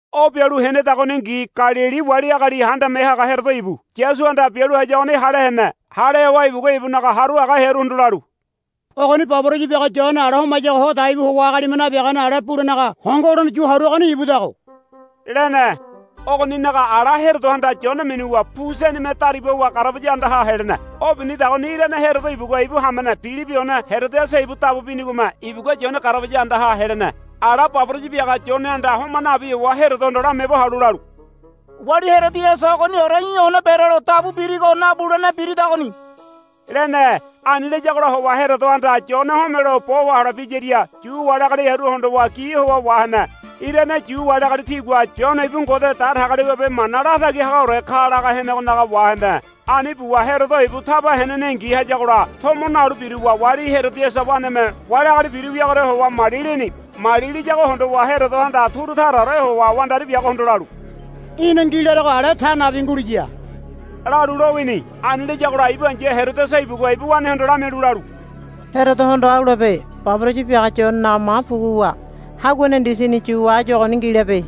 O bialu henedagoningi Galili wali agali handame haga Herodo ibu Yasuhanda bialu hayuagoni hale hene. Hale howa ibugua ibunaga haru haga hearuhondo lalu, Ogoni baboraya biaga Yone ala homayago ho dai bu howa agalime nabiagane ale bulenaga hongo holene yu haruagoni ibudago, lene. Ogoninaga ala Herodohanda Yone minuwa pu senime dariba howa garabaya andaha helene. O binidagoni irane Herodo ibugua ibu hamene Pilibi one Herodiasa ibu dabu binigome ibugua Yone garabaya andaha helene. Ala baboraya biaga Yonehanda homa nabi howa Herodohondo lamiaabo halu lalu, Wali Herodiasa ogoniore í̠ one berelo dabu birigo nabulene biridagoni, lene. Ani layagola howa Herodohanda Yone homelo bo wahole biyaria Yu wali agali hearu hondowa gi howa wahene. Irane Yu wali agali tigua, Yone ibu Ngode Datagaliwabe mana latagi hagaore ka, laga henegonaga wahene. Ani buwa Herodo ibu taba henenengi hayagola tomo nalu biruwa wali Herodiasa waneme wali agali biru wiagoria howa mali lini. Mali liyago hondowa Herodohanda turu taraore howa wandari biagohondo lalu, Í̠na ngi larego ale ta nabi nguliya, lalu lowini. Ani layagola ibu ai̱ya Herodiasa ibugua ibu wanehondo lamialu lalu, Herodohondo au labe. Baboraya biaga Yonenaga ma puguwa haguane ndisini yuwa áyu ogoni ngi labe,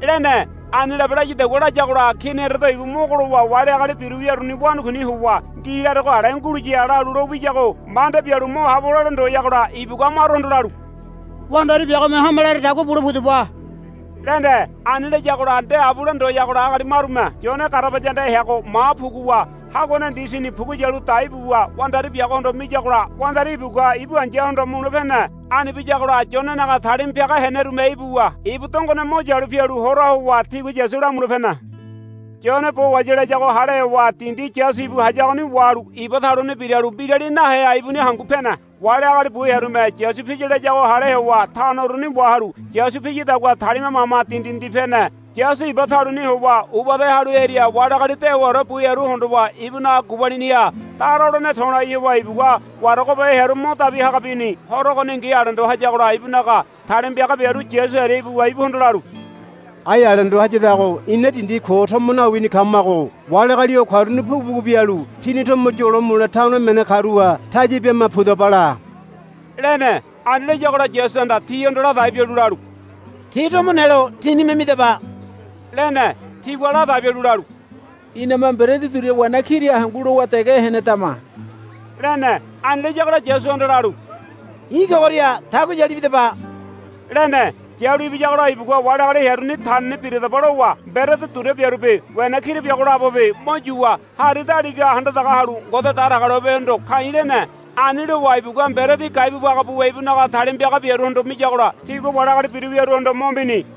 lene. Ani labe layadagua layagola Kini Herodo ibu mogo lowa wali agali biru wiaru wanakuini howa, Ngi larego ale nguliya, lalu lo wiyago manda bialu mo habo lole ndoyagola ibugua maruhondo lalu, Wandari biagome hame laradagua bule pudaba, lene. Ani layagola nde abule ndoyagola agali marume Yone garabaya andaha heago ma puguwa haguane ndisini pugu yalu dai buwa wandari biagohondo miyagola wandari ibugua ibu ai̱yahondo mule pene. Ani biyagola Yonenaga talima piaga henerume ibuwa ibu dongone mo yalu pialu hora howa tigua Yasu lamule pene. Yone bo wahaya layago hale howa dindi Yasu ibu hayagoni wahalu iba taluni biralu mbirali naheha ibuni hangu pene. Wali agali bu hearume Yasu piya layago hale howa tano uruni wahalu Yasu piyadagua talima mama dindi dindi pene. Yasu iba taluni howa uba ede halu hearia wali agali dewaore bu hearu hondowa ibunaga gubaliniha dara holene to̱lai howa ibugua waragobe hearu mo dabi haga bini. Horo ogoningi alendo hayagola ibunaga talima piaga biaru Yasu hearia ibuwa ibuhondo lalu, Ai alendo hayadago ina dindi ko tomo nawini kamago wali agali o karuni pugu pugu bialu tini tomo yolo mule tano emene karuha taya bima pudaba la, lene. Ani layagola Yasuhanda tihondo ladai bialu lalu, Ti tomo nelo tínime midaba, lene. Tigua ladai bialu lalu, Iname mberedi duria wena kira hangu lowa dege henedama, lene. Ani layagola Yasuhanda lalu, I̱ kogoria tagu yalu ibidaba, lene. Yalu ibiyagola ibugua wali agali hearuni, Tanini biradaba, lowa mberedi duria biarubi wena kira biago labobi mo yuwa hari daligaha handa daga halu Ngode Datagaliwabehondo ka̱i̱ lene. Ani lowa ibugua mberedi gai bu baga buwa ibunaga talima piaga biaruhondo miyagola tigua wali agali biru wiaruhondo mo mini.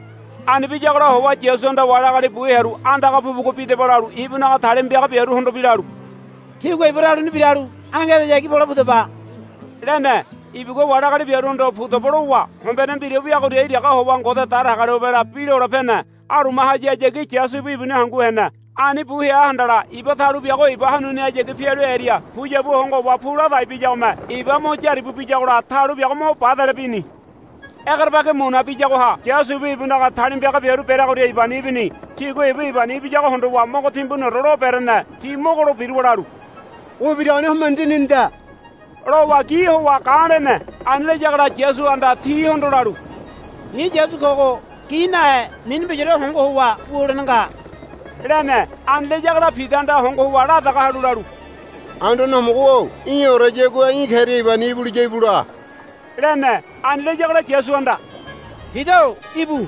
Ani biyagola howa Yasuhanda wali agali bu hearu andaga pugu pugu bidaba lalu ibunaga talima piaga biaruhondobi lalu, Tígua iba taluni biralu ange edeyagi pole pudaba, lene. Ibugua wali agali biaruhondo, Pudaba, lowa hombene mbira wiagoria iraga howa Ngode Datagaliwabela bi lole pene. Aruma hayahayagi Yasu ibu ibuni hangu hene. Ani bu hea handala iba talu biago iba hanunihayagi pialu hearia puyabu hongo howa pu ladai biyagome iba mo yaribu biyagola talu biago mo badele bini. Egerebagi muna biyagoha Yasu ibu ibunaga talima piaga biaru bereagoria ibani ibini. Tigua ibu ibani ibiyago hondowa mogo timbuniore lo berene. Ti mogo lo biruwa lalu, O ibiragoni homene dininida, lowa gi howa ga̱ lene. Ani layagola Yasuhanda tihondo lalu, I̱ Yasu kogo gi nahe mini mbiraore hongo howa wu holene nga, lene. Ani layagola Pidahanda hongo howa la daga halu lalu, Anduane Homogo-o í̠oreyagua í̠ keria ibani ibuliya íbu la, lene. Ani layagola Yasuhanda, Pida-o íbu,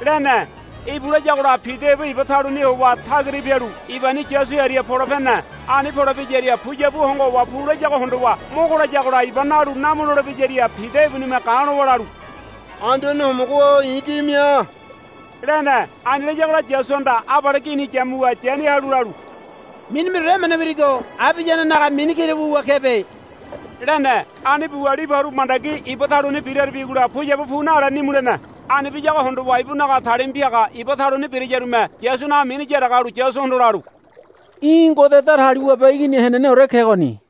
lene. Íbu, layagola Pida ibu iba taluni howa tagira pialu ibani Yasu hearia pole pene. Ani pole piyaria puyabu hongo howa pu layago hondowa mogo layagola iba nalu namu lole biyaria Pida ibunime ga̱ lowa lalu, Anduane Homogo-o i̱ gi mia, lene. Ani layagola Yasuhanda abale gini yamuwa yani halu lalu, Mini mbiraore emene wirigo abiyanenaga mini kira wuwa kebe, lene. Ani buwa libu haru mandagi iba taluni biraribigola puyabu pu nale nimu lene. Ani biyago hondowa ibunaga talima piaga iba taluni birayarume Yasunaga mini yaraga halu Yasuhondo lalu, Í̠ Ngode Datagaliwabe Igini heneneore kegoni,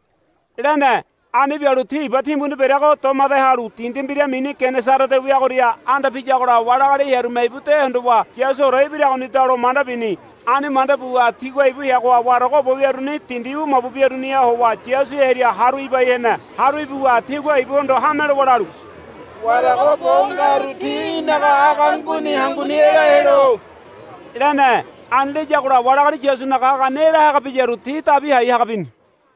lene. Ani bialu ti iba timbuni bereago domade halu dindi mbira mini Genesarete wiagoria anda piyagola wali agali hearume ibu de hondowa, Yasuore ibiragonida, lo manda bini. Ani manda buwa tigua ibu heagoha warago bo wiaruni dindi wu mabu biaruniha howa Yasu hearia haru ibai hene. Haru ibuwa tigua ibuhondo hame lowa lalu, Warago bo ngaru ti í̠naga aga nguni hanguni ela helo, lene. Ani layagola wali agali Yasunaga agani ela haga biyaru ti dabi hai haga bini.